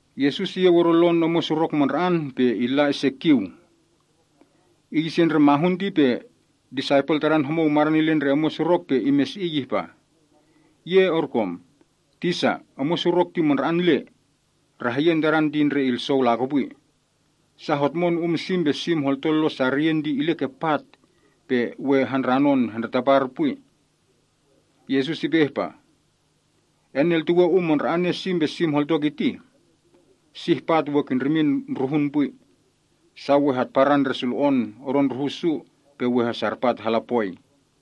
Yesus iyeu odo lon omwen surok mandra‑an pe illa ise kiu. Iy ise ndre mahun ti pe disaipel Tadan homou madan ile ndre omwen surok pe imesi‑iy ihpah, “Ye orkom. Tisa, omwen surok ti mandra‑an le. Rahyen tadan ti ndre ilsou lakopwi. Sa hotmon um sim pe sim holto lon sariyen ti ile ke pat, pe we handranon hendretapar pwi.” Yesus ipe ihpah, “Eneltuwe um mandra‑ane sim pe sim holto kitih? Sih pat we kindrimin ndruhun pwi. Sa we hatparan ndre sulo‑on odo ndrohu’ su pe we hesarpat hala poi.”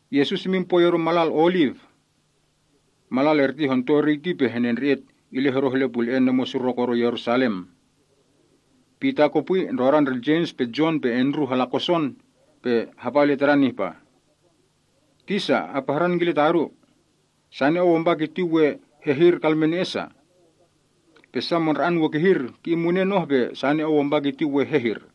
Yesus imin pwoi odo malal Oliv. Malal erti honto eriy ti pe henendre‑et ile hodoh ile pule‑en omwen surok odo Yerusalem. Pita kopwi, ndrodan ndre Jems pe Jon pe Andrew hala koson, pe hapa ile Tadan ihpah, “Tisa, apahran kile ta odu. Sane Ou ampa kiti we hehir kalmene‑e sa? Pe sa mandra‑an we kihir ki‑in munen oh pe sane Ou ampa kiti we hehir?”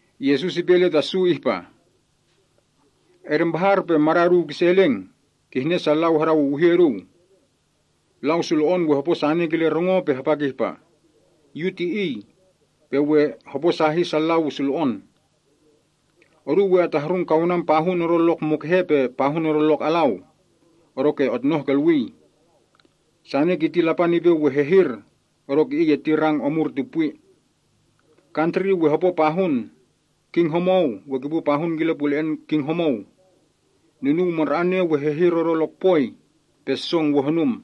Yesus ipe ile ta su ihpah, “Edempahar pe mada’ oduu kise eleng, kihne sa lau hadawiwihi oduu. Lau sulo‑on we hopo sane kile rongo pe hapa kihpah, ‘Yu ti Iy,’ pe we hoposahi sa lau sulo‑on. Oduu we atahrung kaunan pahun odo lok mukehe pe pahun odo lok alau, odoke otnoh kolwii. Sane kiti Lapan ipe we hehir, odoke iy erti rang omur ti pwi. Kantri we hopo pahun. King homou we kipu pahun kile pule‑en king homou. Nunuw mandra‑ane we hehir odo lokpoi. Pe song we honum.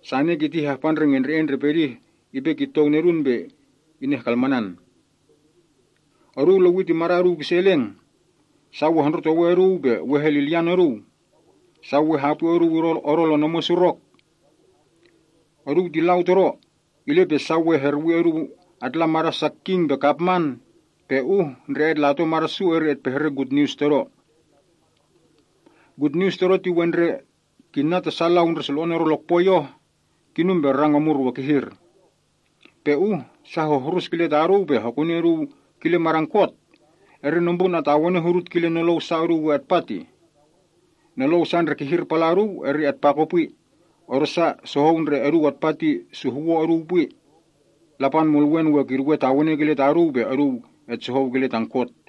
Sane kiti hahpa ndre ngendre‑en ndre pedih ipe kitou nedun pe inehkalmanan. “Oduu lewi ti mada’ oduu kise eleng. Sa we hondrotowe oduu pe we helilyan oduu. Sa we hapwi oduu odo lon omwen surok. Oduu ti lau Todo, ile pe sa we herwi oduu atla mada’ sa king pe kapman, pe uh ndre etlato mada’ su eri etpehre gutnius Todo. Gutnius Todo ti we ndre kinna ta sa lau ndre sulo‑on odo lokpoi oh, kinum pe rang omur we kihir. Pe uh sa hohrus kile ta oduu pe hokuni oduu kile madan kot, eri nombrun atawene hudut kile nolou sa oduu we atpa tih. Nolou sa ndre kihir pala’ oduu eri atpa kopwi, odosa sohou ndre oduu atpa ti suhwo’ oduu pwi. Lapan Mulwen we kiduwe tawene kile ta oduu pe oduu etsohou kile tan kot.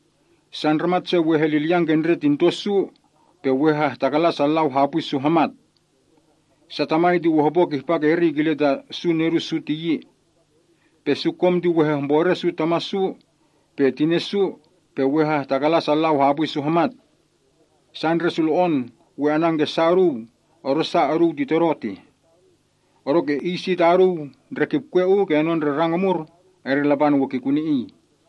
“Sa ndramat se we helilyan ke ndre tinto’ su, pe we hahtakalan sa lau hapwi su hamat. Sa tamai ti we hopo kihpa erti kile ta su nedu’ su ti yi. Pe su kom ti we hehmbore su tama’ su, pe tine’ su, pe we hehtakalan sa lau hapwi su hamat. Sa ndre sulo‑on we anan ke sa oduu odosa oduu ti Todo tih. Odoke iy si ta oduu ndre kipkwe uu kenon ndre rang omur, eri Lapan we kikuni iy.”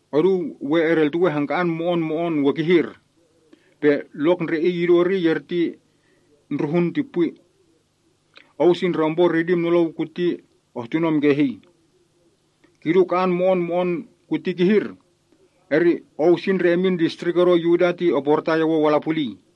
“Oduu we edeltuwe hangka‑an mo‑on mo‑on we kihir, pe lok ndre ka‑an ti idu eriy, eri ndruhun ti pwi.” (Ou si ndre ompo ritim nolou kuti ohtunom kehii.) “Kidu ka‑an mo‑on kuti kihir, eri ou si ndre emin distrik odo Yuda ti oportai owou ala puliy.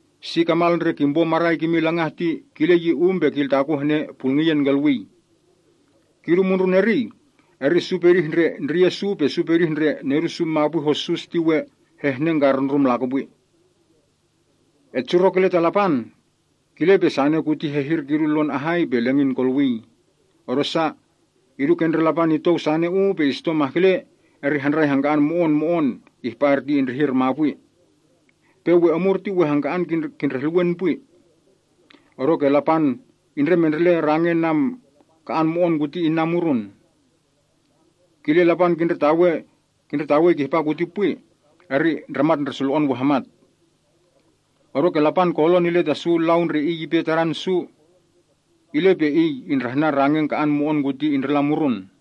Si kamal ndre kimpo marai kimin langah ti kile yi um pe kiltakun hene pulngiyen kolwii. Kidu mundrun eriy, eri su pedih ndre ndriye’ su pe su pedih ndre nedu’ su mapwi hossus ti we hehnengkarundrum lakopwi. Etsurok Lapan, kile pe sane kuti hehir kidu lon ahai pe lengin kolwii, odosa, idu ke ndre Lapan itou sane uu pe isito mahkele, eri handrai hangka‑an mo‑on mo‑on ihpa erti indrihir mapwi. Pe we omur ti we hangka‑an kindrehluwen pwi. Odoke Lapan indremendrele rangen ka‑an mo‑on kuti inna murun. Kile Lapan kindretawe kihpa kuti pwi, eri ndramat ndre sulo‑on we hamat. Odoke Lapan kolon ile ta su lau ndre Iy ipe Tadan su, ile pe Iy indrahnan rangen ka‑an mo‑on kuti indrila murun.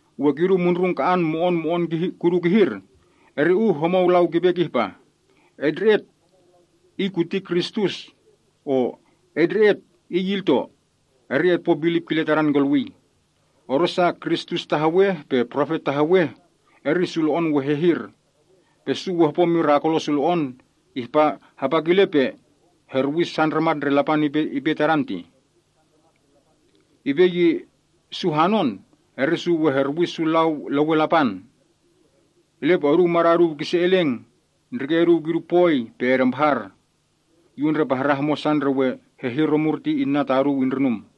“We kidu mundrun ka‑an mo‑on mo‑on kihir kudu, eri uh homou lau kipe kihpah, ‘Etndre‑et, Iy kuti Kristus!’ o, ‘Etndre‑et, Iy ilto!’ eri otpo bilip kile tadan kolwii. Odosa, kristus taheweh pe profet taheweh, eri sulo‑on we hehir. Pe su we hopo mirakulo sulo‑on, hapa kile pe herwi su ndramat ndre Lapan ipe Tadan tih. Ipe ye su hanon, eri su we herwi su lau lewen Lapan. Ile pe oduu mada’ oduu kise eleng, ndrike’ oduu kidu pwoi pe edempahar. Yu undrepahran homosa ndre we hehir omur ti inna ta oduu indrinum.”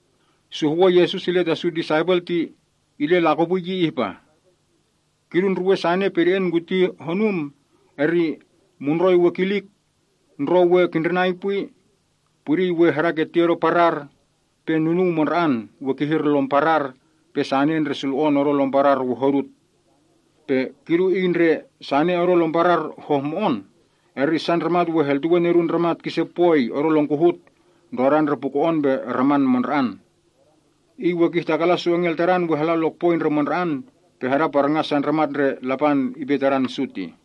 Suhwon Yesus ile ta su disaipel ti ile lakopwi yi ihpah, “Kidu ndruwen sane pede‑en kuti honum eri, “‘Mundroi we kilik, ndrou we kindrinai pwi, pudiy we hadaketi odo parar, pe nunuw mandra‑an we kihir lom parar, pe sane ndre sulo‑on odo lom parar we hodut.’ “Pe kidu iy ndre sane odo lom parar hohmo‑on, eri sa ndramat we heltuwe Nedun Ndramat kise pwoi odo lon kohut, ndrodan ndre puko‑on pe raman mandra‑an. Iy we kihtakalan su engel Tadan we hala lokpoi ndre mandra‑an, pe hadaparngan sa ndramat ndre Lapan ipe Tadan su tih.”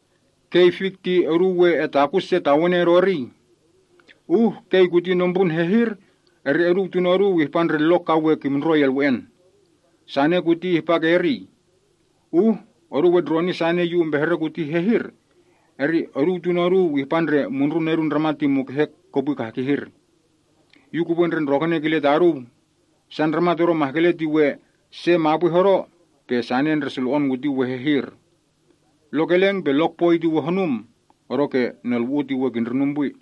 “Kei ndre fik ti oduu we etakun se tawene odo eriy. Uh kei kuti nombrun hehir, eri oduu tuno’ oduu ihpa ndre lok ka we kimndroi elwe‑en. Sane kuti ihpa ke eriy. Uh oduu etndroni sane Yu umpehre kuti hehir, eri oduu tuno’ oduu ihpa ndre mundrun Nedun Ndramat ti mukehe kopwi kah kihir. Yu kupwe ndre ndrokene kile ta oduu! Sa ndramat odo mahkele ti we se mapwi hodo, pe sane ndre sulo‑on kuti we hehir. Lok eleng pe lokpoi ti we hornum, odoke nolwu‑u ti we kindrinum pwi.”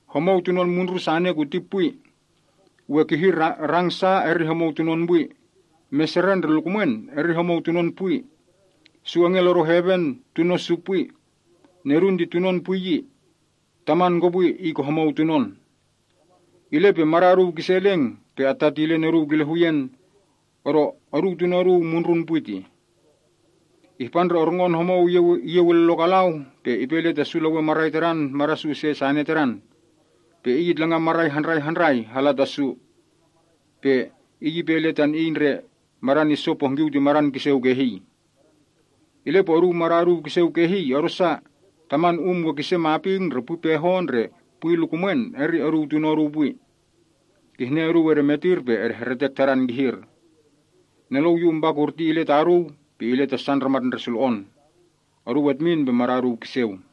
“Homou tunon mundrun sane kuti pwi. We kihir rang sa eri homou tunon pwi. Meseren ndre lukumwen eri homou tunon pwi. Su engel odo heven tuno’ su pwi. Nedun ti tunon pwi yi. Taman kopwi Iy ke homou tunon. Ile pe mada’ oduu kise eleng pe attatilen oduu kile huyen, odo oduu tuno’ oduu mundrun pwi tih. Ihpa ndre orngon homou iyeu ile lok alau pe ipe ile ta su lewen marai tadan mada’ su ise sane tadan. Pe iy itlangan marai handrai handrai hala ta su. Pe iy ipe ile tan iy lau ndre madan iso pohngkiu ti madan kiseu kehii. “Ile pe oduu mada’ oduu kiseu kehii, odosa taman um we kise maping, ndre pehon, ndre pwi lukumwen, eri oduu tuno’ oduu pwi. Kihne oduu edemetir pe edehretek tadan kihir. Nolou Yu umpa kurti ile ta oduu, pe ile ta sa ndramat ndre sulo‑on. Oduu etmin pe mada’ oduu kiseu.”